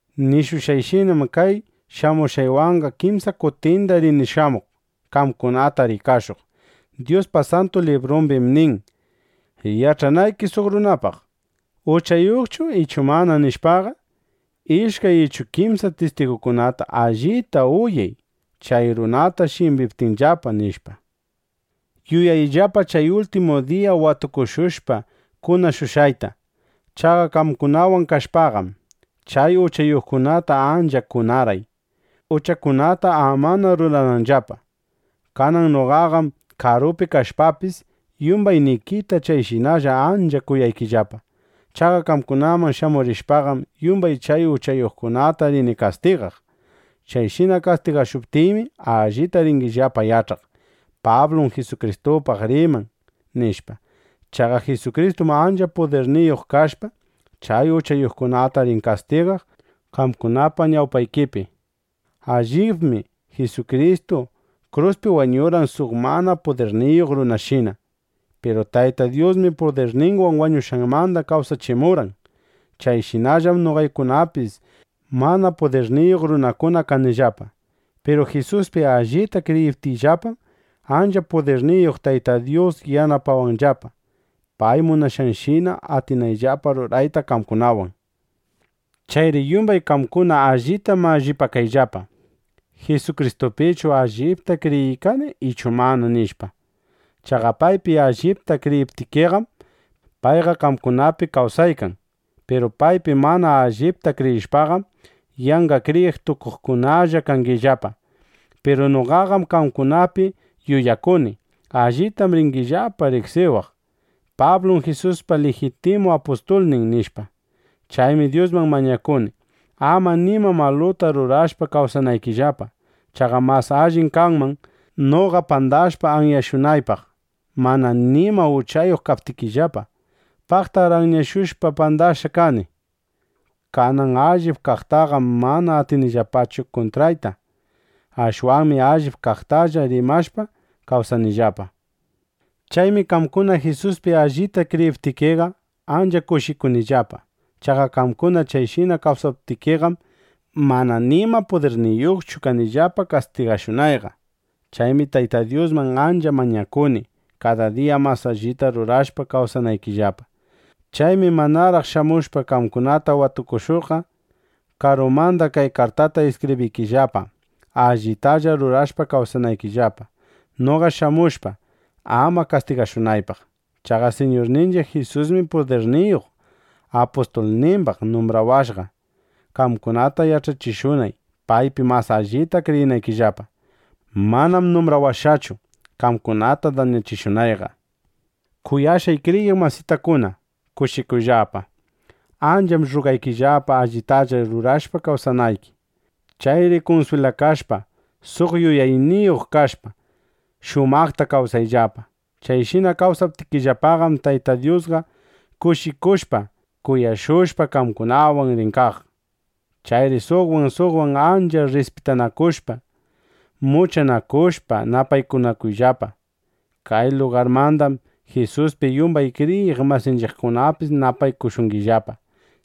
Nishushqayshinam, kay shamushqaywanqa kimsa kutindana rini shamuq, qamkunata rikashuq. Dyuspa Santu Librumbim nin: “Yach'anayki suq runapaq, ¿uchayuqchu ichu mana? nishpaqa, ishkay ichu kimsa tistigukunata allita uyay, chay runata shimbiptinllapa”, nishpa. Yuyayllapa chay ultimu diya watukushushpa kunashushqayta. Chaqa qamkunawan kashpaqam, chay uchayuqkunata ancha kunarqay, uchakunata amana rurananllapa. Kanan noqaqam karupi kashpapis, yumbaynikita chayshinalla ancha kunaykillapa. Chaqa qamkunaman shamurishpaqam, yumbay chay uchayuqkunata rini kastigaq. Chayshina kastigashuptiymi, allita ringillapa yach'aq: Pablum Jisukristupaq riman, nishpa. Chaqa Jisukristum ancha pudirniyuq kashpa, chay uchayuqkunata rin kastigaq qamkunapa ñawpaykipi. Allibmi Jisukristu kruspi wañurqan suq mana pudirniyuq runashina. Piru Tayta Dyusmi pudirninwan wañushqanmanda kawsachimurqan. Chayshinallam noqaykunapis mana pudirniyuq runakuna kanillapa. Piru Jisuspi allita kriyiptiyllapam, ancha pudirniyuq Tayta Dyus yanapawanllapa, pay munashqanshina atinayllapa rurayta qamkunawan. Chayri yumbay qamkuna allita mallipakayllapa: ¿Jisukristupichu allipta kriyiykani ichu mana? nishpa. Chaqa paypi allipta kriyiptikiqam, payqa qamkunapi kawsaykan. Piru paypi mana allipta kriyishpaqam, yanqa kriyiq tukuqkunalla kangillapa. Piru noqaqam qamkunapi yuyakuni: Allitam ringillapa riqsiwaq: Pablum Jisuspa lijitimu apustulnin, nishpa. Chaymi Dyusman mañakuni, ama nima maluta rurashpa kawsanaykillapa. Chaqa mas allim kanman, noqa pandashpa anyashunaypaq, mana nima uchayuq kaptikillapa. Paqtar anyashushpa, pandashqa kani. Kanan allip kaqtaqam mana atinillapachu kuntrayta. Ashwanmi allip kaqtalla rimashpa kawsanillapa. Chaymi qamkuna Jisuspi allita kriyiptikiqa, ancha kushikunillapa. Chaqa qamkuna chayshina kawsaptikiqam, mana nima pudirniyuqchu kanillapa kastigashunayqa. Chaymi Tayta Dyusman ancha mañakuni, kada diya mas allita rurashpa, kawsanaykillapa. Chaymi manaraq shamushpa qamkunata watukushuqqa, karumanda kay kartata iskibriykillapa, allitalla rurashpa kawsanaykillapa, noqa shamushpa, ama kastigashunaypaq. Chaqa Siñurninchiq Jisusmi pudirniyuq apustulnimbaq numbrawashqa, qamkunata yach'achishunay, paypi mas allita kriyinaykillapa. Manam numbrawashqachu, qamkunata dañachishunayqa. Kuyashqay kriyiq masitakuna, kushikuyllapa. Ancham rrugaykillapa, allitalla rurashpa kawsanayki. Chayri kunswilakashpa, suq yuyayniyuq kashpa, shumaqta kawsayllapa. Chayshina kawsaptikillapaqam, Tayta Dyusqa kushichishushpa, kuyashushpa, qamkunawan rin kaq. Chayri suqwan suqwan ancha rrispitanakushpa, muchanakushpa napaykunakuyllapa. Kay lugarmandam, Jisuspi yumbay kriyiq masinchiqkunapis napaykushungillapa.